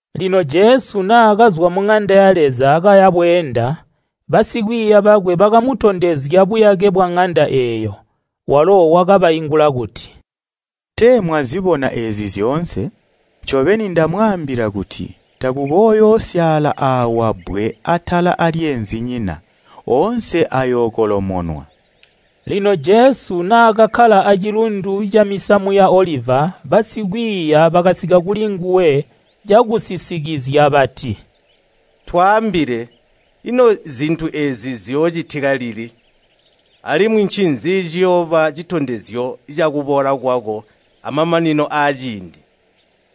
Lino Jesu naakazwa muŋanda ya Leza kaya bweenda, basikwiiya bakwe bakamutondezya buyake bwaŋanda eeyo. Walo wakabaingula kuti, “Tee mwazibona eezi zyoonse? Ncobeni ndamwaambila kuti takukooyoosyaala aawa bbwe atala aalyeenzinyina. Oonse ayookolomonwa.” Lino Jesu naakakkala aacilundu camisamu ya Oliva basikwiiya bakasika kulinguwe cakusisikizya bati, “Twaambile, ino zintu eezi ziyoocitika lili? Alimwi ncinzi ciyooba citondezyo ca kuboola kwako amamanino aaciindi?”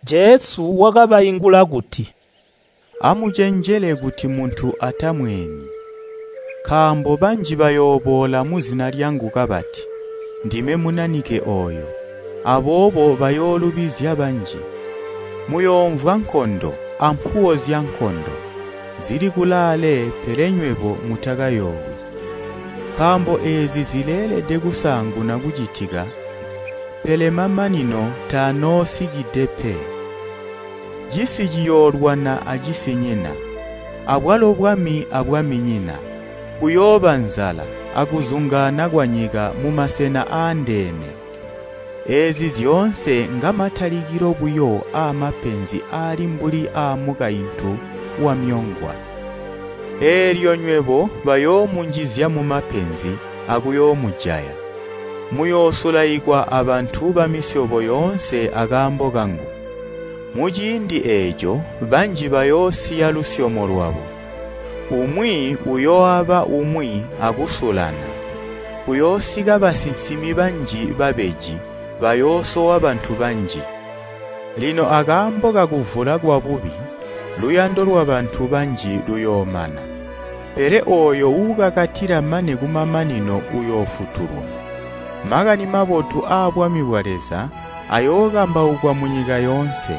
Jesu wakabaingula kuti, “Amucenjele kuti muntu atamweeni. Nkaambo banji bayooboola muzina lyangu kabati, ‘Ndime Munanike ooyo,’ aboobo bayoolubizya banji. Muyoomvwa nkondo ampuwo zyankondo, zili kulaale pele nywebo mutakayoowi. Nkaambo eezi zileelede kusaanguna kucitika pele mamanino tanoosikide pe, cisi ciyoolwana acisinyina, abwalo bwami abwaminyina. Kuyooba nzala akuzungaana kwanyika mumasena aandeene. Eezi zyoonse ngamatalikilo buyo aamapenzi aali mbuli aamukaintu wamyongwa. “Eelyo nywebo bayoomunjizya mumapenzi akuyoomujaya. Muyoosulaikwa abantu bamisyobo yoonse akaambo kangu. Muciindi eeco banji bayoosiya lusyomo lwabo. Umwi uyooaba umwi akusulana. Kuyoosika basinsimi banji babeji, bayoosowa bantu banji. Lino akaambo kakuvula kwabubi, luyando lwabantu banji luyoomana. Pele ooyo uukakatila mane kumamanino uyoofutulwa. Makani Mabotu aabwami bwa Leza ayookambaukwa munyika yoonse,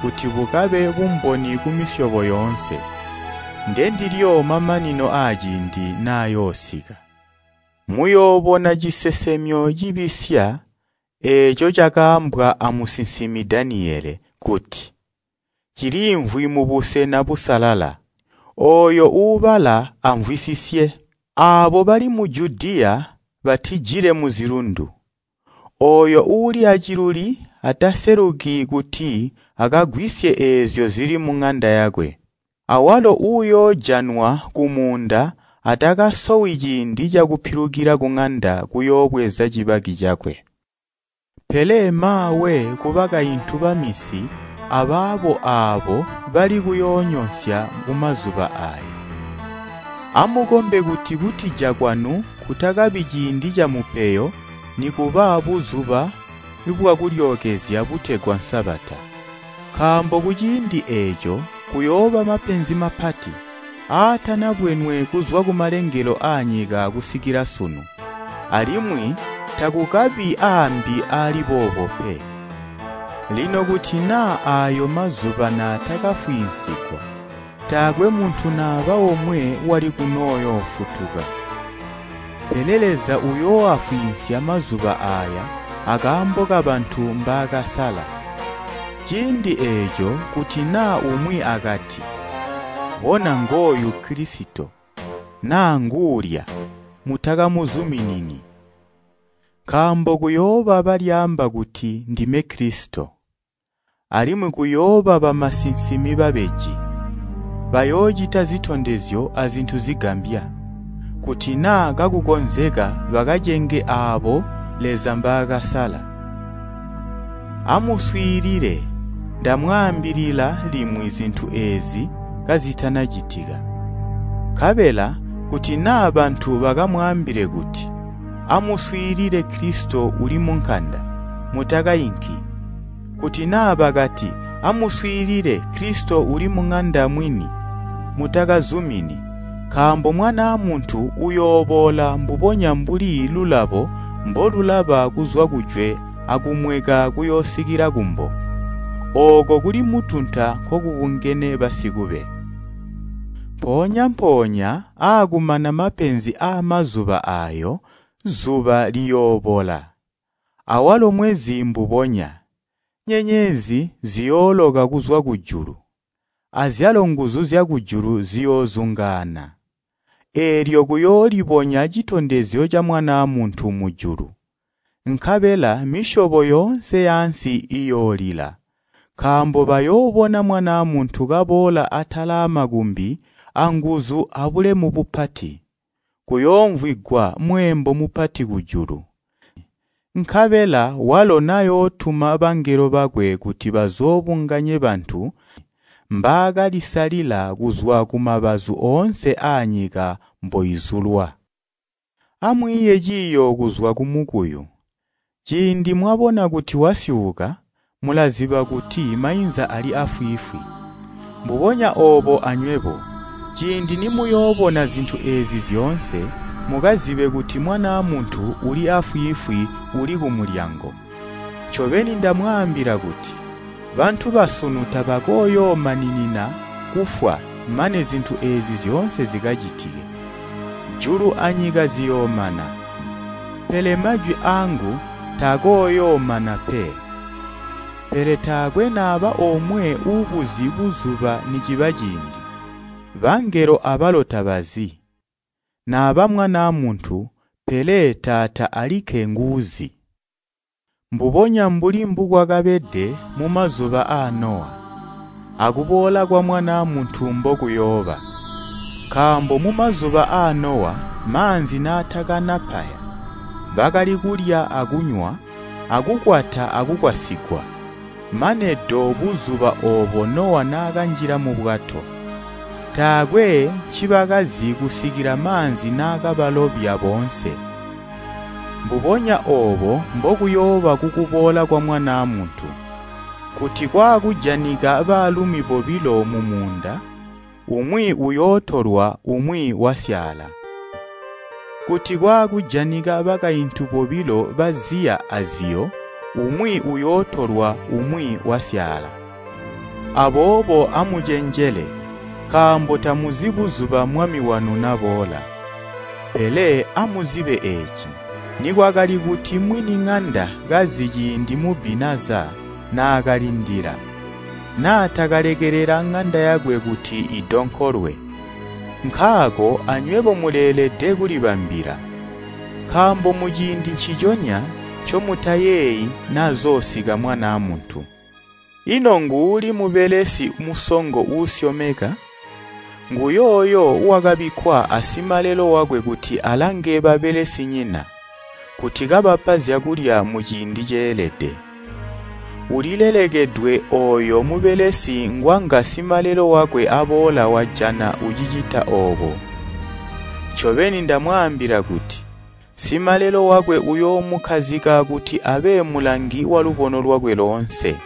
kuti bukabe bumboni kumisyobo yoonse. Ndendilyo mamanino aaciindi nayoosika. “Muyoobona cisesemyo cibisya eeco cakaambwa amusinsimi Daniyele kuti, ‘Ciliimvwi mubusena busalala’ (ooyo uubala amvwisisye). Aabo bali mu Judiya batijile muzilundu. Ooyo uuli aciluli ataseluki kuti akagwisye eezyo zili muŋanda yakwe. Awalo uuyoojanwa kumuunda atakasowi ciindi cakupilukila kuŋanda kuyoobweza cibaki cakwe. Pele maawe kubakaintu baminsi abaabo aabo bali kuyoonyonsya kumazuba aayo! Amukombe kuti kutija kwanu kutakabi ciindi camupeyo nikuba Buzuba bwa Kulyookezya butegwa Sabata. Nkaambo kuciindi eeco kuyooba mapenzi mapati, aatanabwenwe kuzwa kumalengelo aanyika kusikila sunu, alimwi takukabi aambi aali boobo pe. Lino kuti naa aayo mazuba naatakafwiinsigwa, taakwe muntu naba omwe wali kunoyoofutuka, pele Leza uyooafwiinsya mazuba aaya akaambo kabantu mbaakasala. Ciindi eeco, kuti naa umwi akati, ‘Bona ngooyu Kilisito!’ naa ‘Nguulya!’ mutakamuzuminini. Nkaambo kuyooba balyaamba kuti, ‘Ndime Kilisito,’ alimwi kuyooba bamusinsimi babeji! Bayoocita zitondezyo azintu zigambya, kuti naa kakukonzeka bakacenge aabo Leza mbaakasala. Amuswiilile, ndamwaambilila limwi zintu eezi kazitana citika. Nkabela kuti naa bantu bakamwaambile kuti, ‘Amuswiilile, Kilisito uli munkanda,’ mutakainki. Kuti naa bakati, ‘Amuswiilile, Kilisito uli muŋanda mwini,’ mutakazumini. Nkaambo Mwanaa Muntu uyooboola mbubonya mbuli lulabo mbolulaba kuzwa kujwe akumweka kuyoosikila kumbo. Ooko kuli mutunta nkokubungene basikube. “Mpoonya-mpoonya aakumana mapenzi aamazuba aayo zuba liyoobola, awalo mweezi mbubonya, nyenyezi ziyooloka kuzwa kujulu, azyalo nguzu zyakujulu ziyoozungaana. Eelyo kuyoolibonya citondezyo ca Mwanaa Muntu mujulu, nkabela misyobo yoonse yaansi iyoolila, nkaambo bayoobona Mwanaa Muntu kaboola atala aamakumbi anguzu abulemu bupati. Kuyoomvwigwa mweembo mupati kujulu. Nkabela walo nayootuma bangelo bakwe kuti bazoobunganye bantu mbaakalisalila kuzwa kumabazu oonse aanyika mboizulwa. “Amwiiye ciiyo kuzwa kumukuyu. Ciindi mwabona kuti wasyuuka, mulaziba kuti mainza ali aafwiifwi. Mbubonya oobo anywebo, ciindi nimuyoobona zintu eezi zyoonse, mukazibe kuti Mwanaa Muntu uli aafwiifwi uli kumulyango. Ncobeni ndamwaambila kuti, bantu basunu tabakooyoomaninina kufwa mane zintu eezi zyoonse zikacitike. Julu anyika ziyoomana, pele majwi aangu taakooyoomana pe. “Pele taakwe naba omwe uubuzi buzuba niciba ciindi. Bangelo abalo tabazi, naba Mwanaa Muntu, pele Taata alikke nguuzi. Mbubonya mbuli mbukwakabede mumazuba aa Nowa, akuboola kwa Mwanaa Muntu mbokuyooba. Nkaambo mumazuba aa Nowa maanzi naatakana paya, bakali kulya akunywa akukwata akukwatisyigwa, mane do buzuba oobo Nowa naakanjila mubwato. Taakwe ncibakazi kusikila maanzi naakabalobya boonse. Mbubonya oobo mbokuyooba kukuboola kwa Mwanaa Muntu. Kuti kwaakujanika baalumi bobilo mumuunda, umwi uyootolwa umwi wasyaala. Kuti kwaakujanika bakaintu bobilo baziya aziyo umwi uyootolwa umwi wasyaala. Aboobo amucenjele, nkaambo tamuzi buzuba Mwami wanu naboola. Pele amuzibe eeci, nikwakali kuti mwiniŋanda kazi ciindi mubbi naza naakalindila, naatakalekelela ŋanda yakwe kuti idonkolwe. Nkaako anywebo muleelede kulibambila, nkaambo muciindi nciconya ncomutayeeyi nazoosika Mwanaa Muntu. “Ino nguuli mubelesi musongo uusyomeka? Nguyooyo wakabikkwa asimalelo wakwe kuti alange babelesinyina, kuti kabapa zyakulya muciindi ceelede. Ulilelekedwe ooyo mubelesi ngwanga simalelo wakwe aboola wajana ucicita oobo. Ncobeni ndamwaambila kuti, simalelo wakwe uyoomukkazika kuti abe mulangi walubono lwakwe loonse.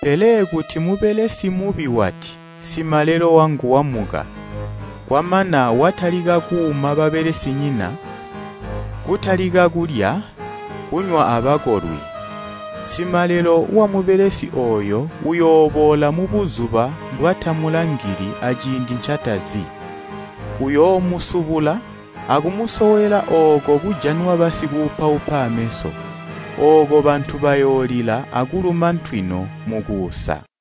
Pele kuti mubelesi mubi wati, ‘Simalelo wangu wamuka,’ kwamana watalika kuuma babalesinyina, kutalika kulya, kunywa abakolwi, simalelo wamubelesi ooyo uyooboola mubuzuba mbwatamulangili aciindi ncatazi. Uyoomusubula, akumusowela ooko kujanwa basikuupaupa aameso. Ooko bantu bayoolila akuluma ntwino mukuusa.”